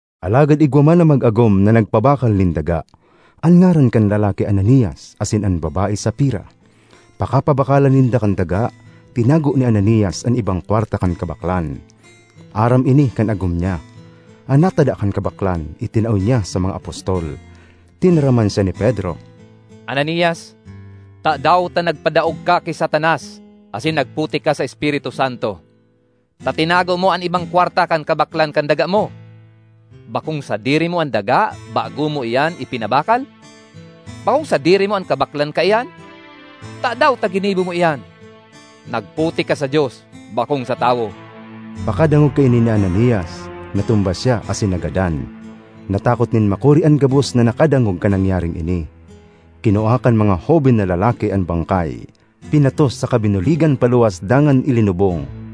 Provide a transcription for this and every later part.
Alagad igwa man na mag-agom na nagpabakal nin daga. An ngaran kan lalaki Ananias, asin an babae, Safira. Pakapabakalan ninda kan daga, tinago ni Ananias an ibang kwarta kan kabaklan; aram ini kan agom niya. An natada kan kabaklan itinao niya sa mga apostol. Tinaraman siya ni Pedro, “Ananias, tadaw ta nagpadaog ka ki Satanas asin nagputik ka sa Espiritu Santo, ta tinago mo an ibang kwarta kan kabaklan kan daga mo? Bakong sadiri mo an daga bago mo iyan ipinabakal? Bakong sadiri mo an kabaklan kaiyan? Tadaw ta ginibo mo iyan? Nagputik ka sa Dios, bakong sa tawo!” Pakadangog kaini ni Ananias, natumba siya asin nagadan. Natakot nin makuri an gabos na nakadangog kan nangyaring ini. Kinua kan mga hoben na lalaki an bangkay, pinatos saka binuligan paluwas dangan ilinubong.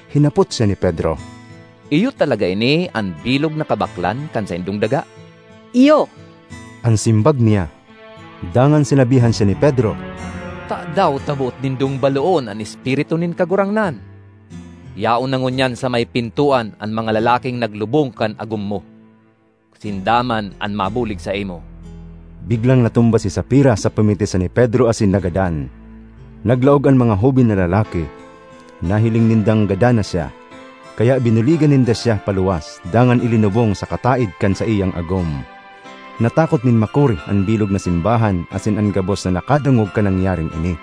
Hinapot siya ni Pedro, “Iyo talaga ini an bilog na kabaklan kan saindong daga?” “Iyo,” an simbag niya. Dangan sinabihan siya ni Pedro, “Tadaw ta boot nindong baloon an Espiritu nin Kagurangnan? Yaon na ngunyan sa may pintoan an mga lalaking naglubong kan agom mo; sinda man an mabulig saimo!” Biglang natumba si Safira sa pamitisan ni Pedro asin nagadan. Naglaog an mga hoben na lalaki; nahiling nindang gadan na siya, kaya binuligan ninda siya paluwas dangan ilinubong sa kataed kan saiyang agom. Natakot nin makuri an bilog na simbahan asin an gabos na nakadangog kan nangyaring ini.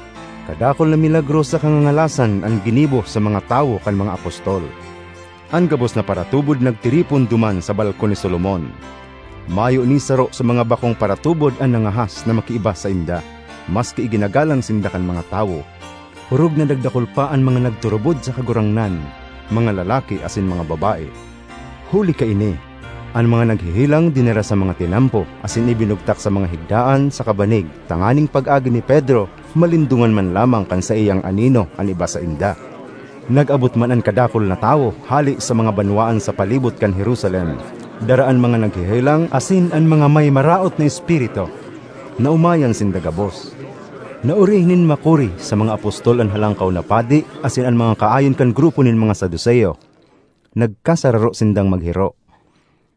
Kadakul na milagro saka ngangalasan an ginibo sa mga tawo kan mga apostol. An gabos na paratubod nagtiripon duman sa Balkon ni Solomon. Mayo ni saro sa mga bakong paratubod an nangahas na makiiba sainda, maski iginagalang sinda kan mga tawo. Orog na nagdakul pa an mga nagturubod sa Kagurangnan, mga lalaki asin mga babae. Huli kaini, an mga naghehelang dinara sa mga tinampo asin ibinugtak sa mga higdaan saka banig tanganing pag-agi ni Pedro malindongan man lamang kan saiyang anino an iba sainda. Nag-abot man an kadakul na tawo hale sa mga banwaan sa palibot kan Jerusalem, dara an mga naghehelang asin an mga may maraot na espiritu; naomayan sinda gabos. Naori nin makuri sa mga apostol an Halangkaw na Padi asin an mga kaayon kan grupo nin mga Saduceo. Nagkasararo sindang maghiro.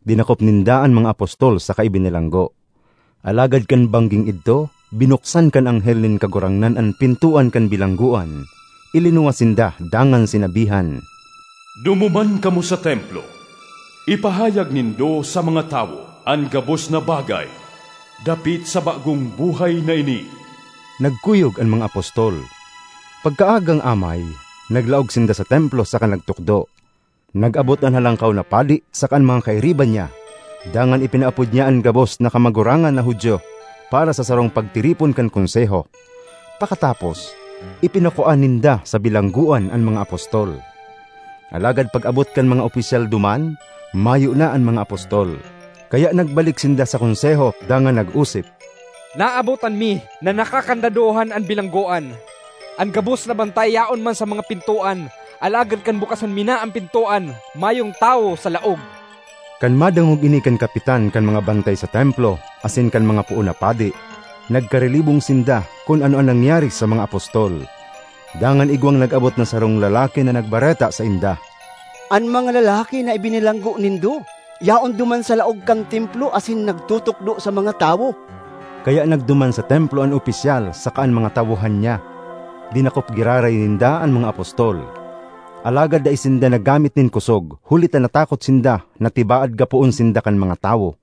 Dinakop ninda an mga apostol saka ibinilanggo. Alagad kan bangging idto, binuksan kan anghel nin Kagurangnan an pintoan kan bilanggoan, ilinuwas sinda dangan sinabihan, ”Dumuman kamo sa Templo; ipahayag nindo sa mga tawo an gabos na bagay dapit sa bagong buhay na ini.” Nagkuyog an mga apostol; pagkaagang amay, naglaog sinda sa Templo saka nagtukdo. Nag-abot an Halangkaw na Padi saka an mga kairiba niya, dangan ipinaapod niya an gabos na kamagurangan na Judio para sa sarong pagtiripon kan Konseho. Pakatapos, ipinakua ninda sa bilanggoan an mga apostol. Alagad pag-abot kan mga opisyal duman, mayo na an mga apostol. Kaya nagbalik sinda sa Konseho dangan nag-osip, ”Naabotan mi na nakakandadohan an bilanggoan. An gabos na bantay yaon man sa mga pintoan alagad kan bukasan mi na an pintoan, mayong tawo sa laog!” Kan madangog ini kan kapitan kan mga bantay sa Templo asin kan mga poon na padi, nagkarilibong sinda kun ano an nangyari sa mga apostol. Dangan igwang nag-abot na sarong lalaki na nagbareta sainda, “An mga lalaki na ibinilanggo nindo yaon duman sa laog kan Templo asin nagtutukdo sa mga tawo!” Kaya nagduman sa Templo an opisyal saka an mga tawohan niya; dinakop giraray ninda an mga apostol. Alagad dai sinda naggamit nin kosog, huli ta natakot sinda na tibaad gapoon sinda kan mga tawo.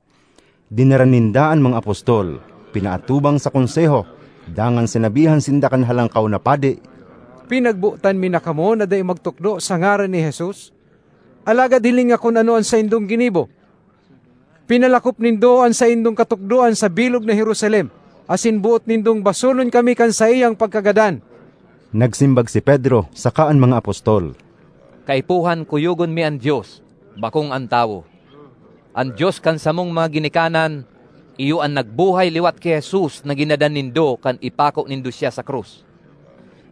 Dinara ninda an mga apostol, pinaatubang sa Konseho dangan sinabihan sinda kan Halangkaw na Padi, ”Pinagbotan mi na kamo na dai magtukdo sa ngaran ni Jesus, alagad hilinga kun ano an saindong ginibo! Pinalakop nindo an saindong katukdoan sa bilog na Jerusalem asin boot nindong basolon kami kan saiyang pagkagadan!” Nagsimbag si Pedro saka an mga apostol, “Kaipuhan kuyogon mi an Dios, bakong an tawo. An Dios kan samong mga ginikanan, iyo an nagbuhay liwat ki Jesus na ginadan nindo kan ipako nindo siya sa krus.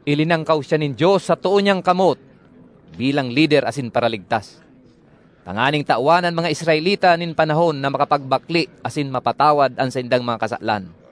Ilinangkaw siya nin Dios sa too niyang kamot bilang Lider asin Paraligtas, tanganing tawan an mga Israelita nin panahon na makapagbakle asin mapatawad an saindang mga kasalan.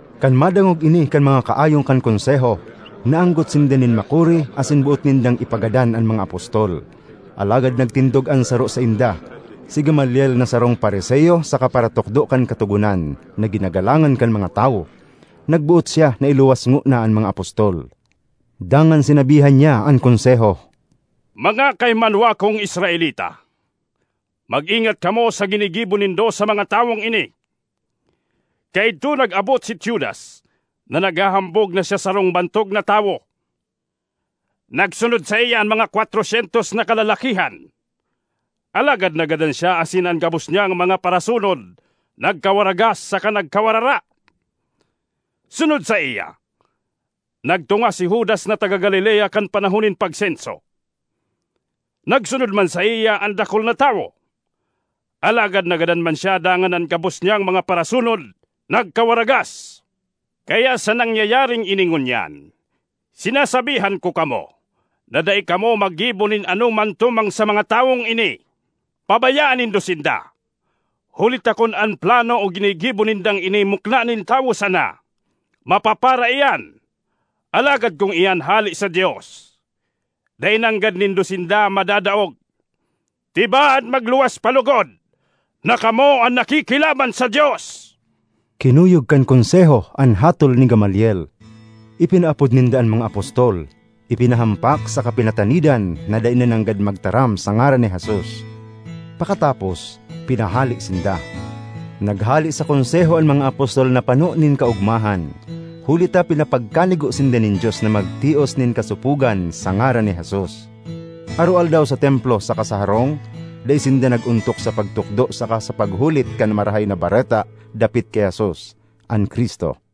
Kan madangog ini kan mga kaayon kan Konseho, naanggot sinda nin makuri asin boot nindang ipagadan an mga apostol. Alagad nagtindog an saro sainda, si Gamaliel na sarong Fariseo saka paratukdo kan Katogonan na ginagalangan kan mga tawo. Nagboot siya na iluwas ngona an mga apostol, dangan sinabihan niya an Konseho, “Mga kahimanwa kong Israelita, mag-ingat kamo sa ginigibo nindo sa mga tawong ini. Kaidto nag-abot si Teudas, na naghahambog na siya sarong bantog na tawo; nagsunod saiya an mga kwatro syentos na kalalakihan. Alagad nagadan siya asin an gabos niyang mga parasunod nagkawaragas saka nagkawarara. Sunod saiya, nagtunga si Judas na taga Galilea kan panahon nin pagsenso. Nagsunod man saiya an dakul na tawo, alagad nagadan man siya dangan an gabos niyang mga parasunod nagkawaragas. Kaya sa nangyayaring ini ngunyan, sinasabihan ko kamo na dai kamo maggibo nin anoman tumang sa mga tawong ini. Pabayaan nindo sinda, huli ta kun an plano o ginigibo nindang ini mukna nin tawo sana, mapapara iyan, alagad kun iyan hale sa Dios, dai nanggad nindo sinda madadaog. Tibaad magluwas pa logod na kamo an nakikilaban sa Dios!” Kinuyog kan Konseho an hatol ni Gamaliel. Ipinaapod ninda an mga apostol, ipinahampak saka pinatanidan na dai na nanggad magtaram sa ngaran ni Jesus. Pakatapos, pinahale sinda. Naghale sa Konseho an mga apostol na pano nin kaogmahan huli ta pinapagkanigo sinda nin Dios na magtios nin kasopogan sa ngaran ni Jesus. Aroaldaw sa Templo saka sa harong, dai sinda nag-ontok sa pagtukdo saka sa paghulit kan Marahay na Bareta dapit ki Jesus, an Cristo.